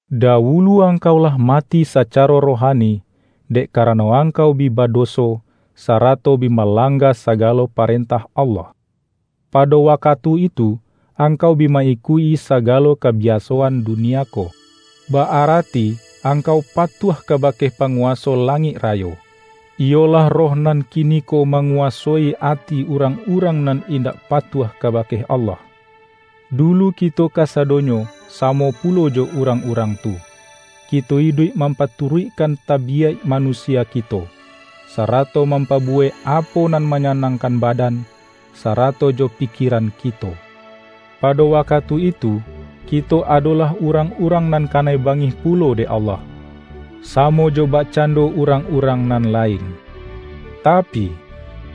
Dawulu angkau lah mati sacaro rohani, dek karano angkau bi badoso, sarato bi malangga sagalo paren-tah Allah. Pado wakatu itu angkau bi ma-ikuik-i sagalo kabiasoan dunia ko; ba-arati angkau patuah kabake pa-nguwaso langik rayo, iyolah roh nan kiniko manguwasoi ati urang-urang nan indak patuah kabake Allah. Dulu kito kasadonyo samo pulo jo urang-urang tu; kito iduik mampaturuikkan tabiyaik manusia kito, sarato mampa-buwek apo nan manyanangkan badan, sarato jo pikieran kito. Pado wakatu itu kito adolah urang-urang nan kanai bangih pulo dek Allah, samo jo bak-cando urang-urang nan lain. Tapi,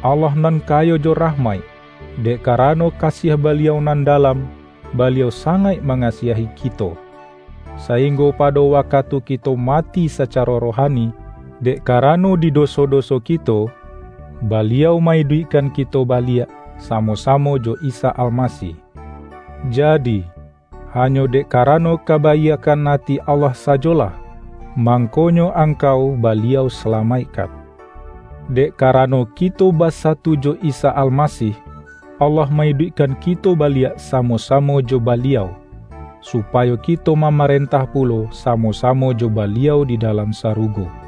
Allah nan kayo jo rahmaik, dek karano kasiah Baliau nan dalam, Baliau sangaik mangasiahi kito, sa-inggo pado wakatu kito mati sacaro rohani, dek karano di doso-doso kito, Baliau ma-iduikkan kito baliak samo-samo jo Isa Almasih. Jadi, hanyo dek karano kabaiakkan ati Allah sajolah, mangkonyo angkau Baliau salamaik-kan. Dek karano kito basatu jo Isa Almasih, Allah ma-iduikkan kito ba-liak samo-samo jo Baliau, supayo kito mamarentah pulo samo-samo jo Baliau di dalam sarugo.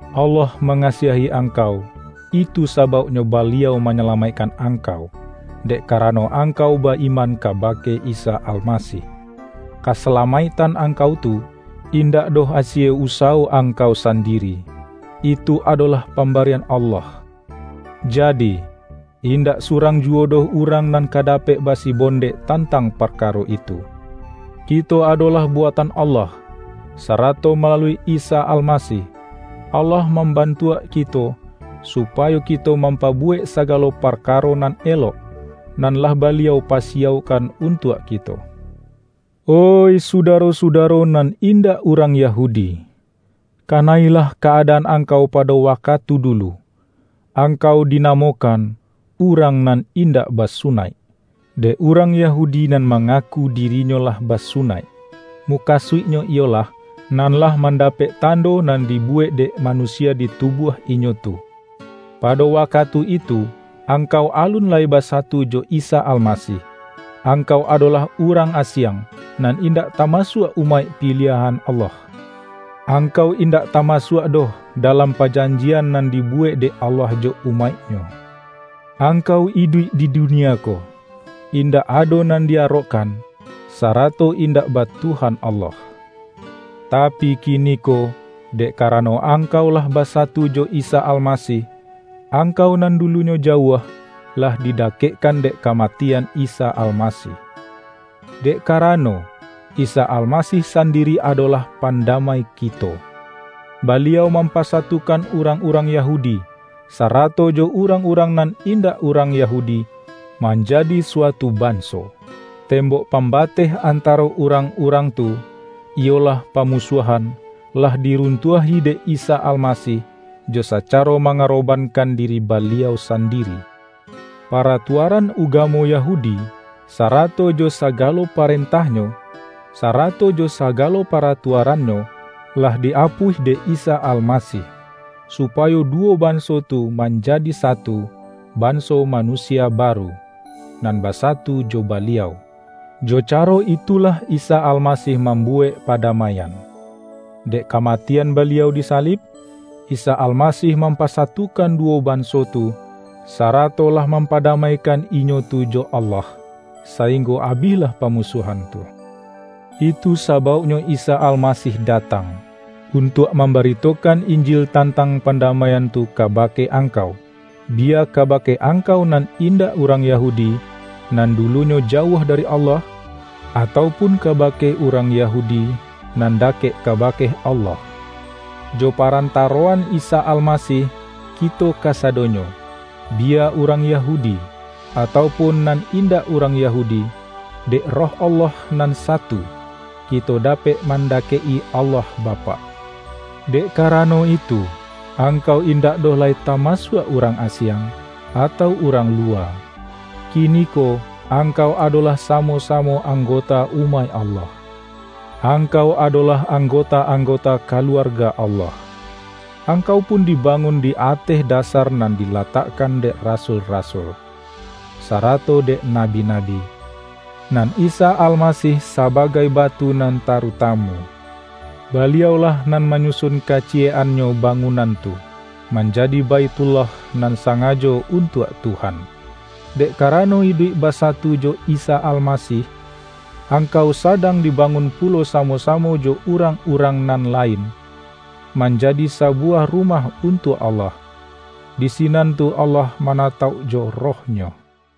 Allah ma-ngasiahi angkau, itu sabauknyo Baliau manyalamaikkan angkau, dek karano angkau ba-iman kabake Isa Almasih. Kasalamaiktan angkau tu, indak doh asie usawo angkau sandiri. Itu adolah pambarian Allah. Jadi, indak surang juwo doh urang nan ka dapek basi-bondek tantang parkaro itu. Kito adolah buatan Allah, sarato malalui Isa Almasih, Allah mambantuak ki-to, supayo kito mampabuwek sagalo parkaro nan elok, nan lah Baliau pa-siyaukkan untuak kito. Oih sudaro-sudaro nan indak urang Yahudi! Kana-ilah ka-adaan angkau pado wakatu dulu: Angkau dinamokan”urang nan indak basu-naik”, dek urang Yahudi nan manga-ku dirinyo lah basunaik, (mukasuik-nyo iyolah, nan lah mandapek tando nan dibuwek dek manusia di tubuah inyo tu). Pado wakatu itu angkau alun lai basatu jo Isa Almasih, ang-kau adolah urang asiang, nan indak tamasuak umaik piliahan Allah. Ang-kau indak tamasuak doh dalam pajan-jian nan dibuwek dek Allah jo umaik-Nyo. Angkau iduik di dunia ko, indak ado nan di-arokkan, sarato indak ba Tuhan Allah. Tapi kiniko, dek kara-no angkau lah basatu jo Isa Almasih, angkau nan dulunyo jauah, lah didakekkan dek kamatian Isa Almasih. Dek karano, Isa Almasih sandiri ado-lah pandamai kito. Baliau mampasa-tukan urang-urang Yahudi, sarato jo urang-urang nan indak urang Yahu-di, manjadi suatu banso. Tembok pam-bateh antaro urang-urang tu, iyolah pamusuahan, lah diruntuahi dek Isa Almasih, jo sacaro mangarobankan di-ri Baliau sandiri. Paratuaran ugamo Yahudi, sarato jo sagalo parentahnyo, sarato jo sagalo paratuarannyo, lah di-apuih dek Isa Almasih, supayo du-wo banso tu manjadi satu banso ma-nusia baru, nan basatu jo Baliau. Jo caro itulah Isa Almasih mambuwek padamaian. Dek kamatian Baliau disalib, Isa Almasih mampasatukan duwo banso tu, sarato lah mampada-maikan inyo tu jo Allah, sainggo abih-lah pamusuahan tu. Itu sabauknyo Isa Almasih datang, untuak mamba-ritokan Injil tantang pandamaian tu kabake angkau; biya kabake angkau nan indak urang Yahudi, nan dulu-nyo jauah dari Allah, atau pun kaba-ke urang Yahudi nan dakek kabake Allah. Jo parantaroan Isa Almasih, kito kasadonyo — biya urang Yahudi, atau pun nan indak urang Yahudi — dek Roh Allah nan Satu, kito dapek mandakek-i Allah Bapak. Dek karano itu, angkau indak doh lai tamasuak urang asiang, atau urang luwa. Kiniko angkau adolah sa-mo-samo anggota umaik Allah. Ang-kau adolah anggota-anggota kaluarga Allah. Angkau pun dibangun di ateh dasar nan dilatakkan dek rasul-rasul, sarato dek nabi-nabi, nan Isa Almasih sabagai batu nan tarutamu. Baliau-lah nan manyusun kaciyek-annyo ba-ngunan tu, manjadi Baithullah nan sa-ngajo untuak Tuhan. Dek karano iduik basatu jo Isa Almasih, angkau sadang dibangun pulo samo-samo jo urang-urang nan lain, manjadi sabu-wah rumah untuak Allah; di sinan tu Allah manatauk jo Roh-Nyo.